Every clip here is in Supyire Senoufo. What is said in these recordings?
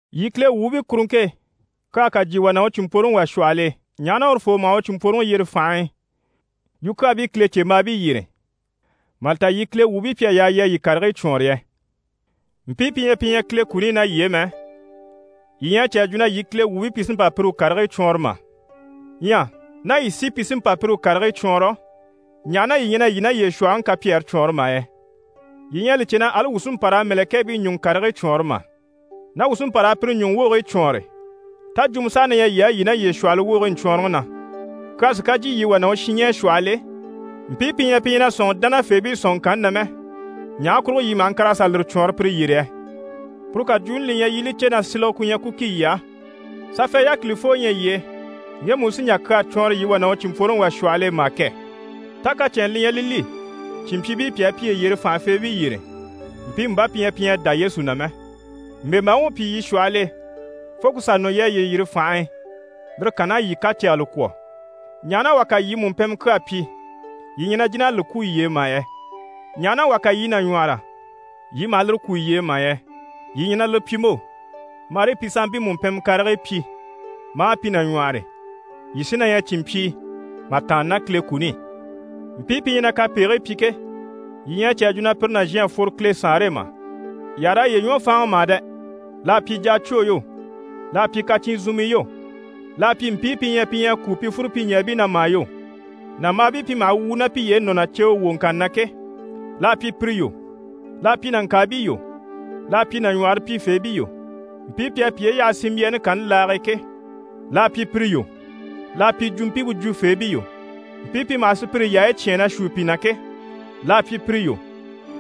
Yii Kile wuubii kuruŋke e, kyaa ká jyè wà ná u cìnmpworoŋi wà shwɔhɔl'e, ɲaha na urufoo maha u cìnmpworoŋi yyere fànhe e yukyaabii Kilecembaabii yyére, mà li ta yii Kile wuubii pi à yaa yii a yii karigii cwɔɔnre yɛ? Mpii pi ɲyɛ pi ɲyɛ Kile kuni i ná yii e mɛ, yii ɲyɛ a cè a jwo na yii Kile wuubii pi sí n‑pa pire u karigii cwɔɔnrɔ mà? Ɲyɛ ná yii sí pi sí n‑pa pire u karigii cwɔɔnrɔ, ɲaha na yii ɲyɛ na yii ná yiye shwɔ̀hɔŋi kapyɛɛre cwɔɔnre mà yɛ? Yii ɲyɛ a li cè na ali wuu sí n‑pa raa mɛ̀lɛkɛɛbii ɲùŋɔ karigii cwɔɔnre mà? Ná wuu sí n‑pa raa pire ɲùŋɔ wogigii cwɔɔnre, tá jwumɔ saha na ɲyɛ yii á, yii ná yiye shwɔ̀hɔŋi wogigii ɲcwɔɔnrɔŋi na? Kyaa sí ká jyè yii wà ná u shinɲɛɛ shwɔhɔl'e, mpii pi ɲyɛ pi ɲyɛ na sɔ̂nŋi dánafeebii sɔ̀nŋɔŋkanni na mɛ, ɲaha kurugo yii maha ŋkàr'a sà lire cwɔɔnrɔ pire yyére yɛ? Puru kajwuuni li ɲyɛ yii i li cè na silege ku ɲyɛ ku ki yii á. Safɛ, yákilifoo ɲyɛ yii e, ŋgemu u sí n‑jà kyaa cwɔɔnrɔ yii wà ná u cìnmpworoŋi wà shwɔhɔl'e mà kɛ? Tá kacɛnnɛ li ɲyɛ li li, cìnmpyiibii pi à piye yiri fànhafeebii yyére, mpiimu bá pi ɲyɛ pi ɲyɛ a dá Yesu na mɛ? Mbèmbaaŋi u pyi yii shwɔhɔl'e, fo ku sà nɔ yii à yiye yiri fànhe e, lire kann'à yii kacɛgɛlɛ kwɔ̀. Ɲaha na wà ká yii mùmpɛnmɛ kyaa pyi, yii ɲyɛ na jìn'a li kwú yiye e mà yɛ? Ɲaha na wà ká yii nàɲwɔhɔrɔ, yii maha lire kwú yiye e mà yɛ? Yii ɲyɛ na lire pyi mo! Marii pi sanmpii mùmpɛnmɛ karigii pyi, maa pi nàɲwɔhɔre, yii sí na ɲyɛ cìnmpyii mà tàanna ná Kile kuni i. Mpii pi ɲyɛ na kapegigii pyi ke, yii ɲyɛ a cè a jwo na pire nàzhan à fworo Kile Saanre e mà? Yii àha raa yiye ɲwɔ fáanŋi mà dɛ! L'à pyi jacwoo yo, l'à pyi kacyinzunmii yo, l'à pyi mpii pi ɲyɛ pi ɲyɛ a kúu pi fúrupyiɲɛɛbii na mà yo, nàmbaabii pi maha wwùu ná piye e nɔ̀ ná ceewe wwoŋkanni na ke, l'à pyi pire yo, l'à pyi nàŋkaabii yo, l'à pyi nàɲwɔhɔre pyifeebii yo, mpii pi à piye yaha sinmbyaani kanni laage e ke, l'à pyi pire yo, l'à pyi jwumpimpe jwufeebii yo, mpii pi maha sùpyire yaayi cyáan na shuu pi na ke, l'à pyi pire yo,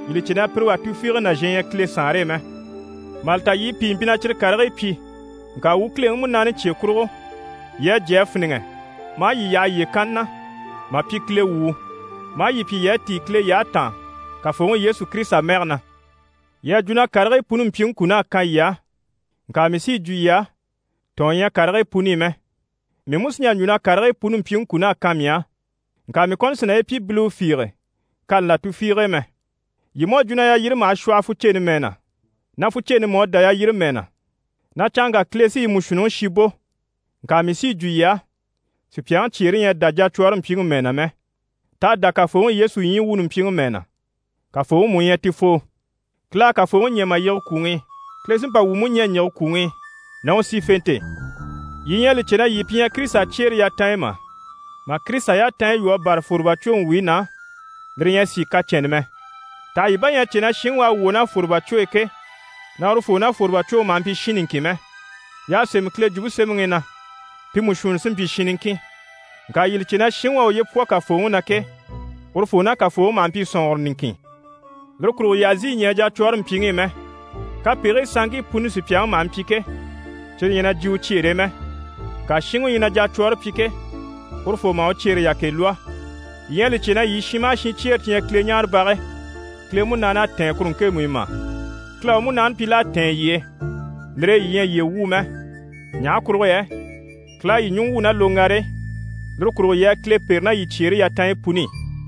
yii li cè na pire wà tufiige nàzhan ɲyɛ Kile Saanre e mɛ. Mà li ta yii pìi mpyi na cyire karigii pyi. Ŋka wuu Kileŋi Munaani cye kurugo, yii à jyé a fíniŋɛ, maa yii yaha yiye kanni na, mà pyi Kile wuu, maa yii pyi yii à tíi Kile yyahe taan Kafooŋi Yesu Kirisita mɛge na. Yii à jwo na karigii puni mpyiŋi kun'à kan yii á, ŋka mii sí yi jwo yii á, tɔ̀ɔn ɲyɛ karigii puni i mɛ. Mii mú sí n‑jà n‑jwo na karigii puni mpyiŋi kun'à kan mii á, ŋka mii kɔni sì naye pyi biliwe fiige kani là tufiige e mɛ. Yii mú à jwo na yalyire maha shwɔhɔ fuceni mɛɛ na, na fuceni mú à dá yalyire mɛɛ na, na canŋka Kile sí yi mú shuunniŋi shi bò, ŋka mii sí yi jwo yii á, sùpyaŋi cyeere ɲyɛ a dá jacwɔɔre mpyiŋi mɛɛ na mɛ. T'à dá Kafooŋi Yesu ɲyii wuuni mpyiŋi mɛɛ na, Kafooŋi mú u ɲyɛ ti foo. Kile à Kafooŋi ɲɛ̀ mà yige kwùŋi i. Kile sí n‑pa wuu mú ɲɛ̀ n‑yige kwùŋi i ná u sífente e. Yii ɲyɛ a li cè na yii pi ɲyɛ Kirisita cyeere yatanɲyi mà? Mà Kirisita yatanɲyi lwɔ́ a bâra fwòrobacwoŋi wuyi na, lire ɲyɛ a sìi kacɛnnɛ mɛ. Taha yii bà ɲyɛ a cè na shinŋi u à wwɔ̀ ná fwòrobacwo e ke, na urufoo ná fwòrobacwoŋi maha mpyi shin niŋkin mɛ? Y'à sémɛ Kile Jwumpe Semɛŋi i na: «Pi mú shuunniŋi sí n‑pyi shin niŋkin.» Ŋka yii li cè na shinŋi u à uye pwɔ Kafooŋi na ke, urufoo ná Kafooŋi maha mpyi sɔ̀nŋɔrɔ niŋkin. Lire kurugo yii àha zìi ɲɛɛ jacwɔɔre mpyiŋi i mɛ. Kapegigii sanŋkii puni sùpyaŋi maha mpyi ke, cyire ɲyɛ na jyè u cyeere e mɛ. Ŋka shinŋi u ɲyɛ na jacwɔɔre pyi ke, urufoo maha u cyeere yakɛ lwɔ́. Yii ɲyɛ a li cè na yii shin maha shin cyeere ti ɲyɛ Kileɲaarebage, Kile Munaani à tɛ̀ɛn kuru ŋkemu i mà? Kile à u Munaani pyi l'à tɛ̀ɛn yii e, lire e yii ɲyɛ yiye wuu mɛ. Ɲaha kurugo yɛ Kile à yii ɲùŋɔ wwû ná loŋgare e. Lire kurugo yii a Kile pêre ná yii cyeere yatanɲyi puni i.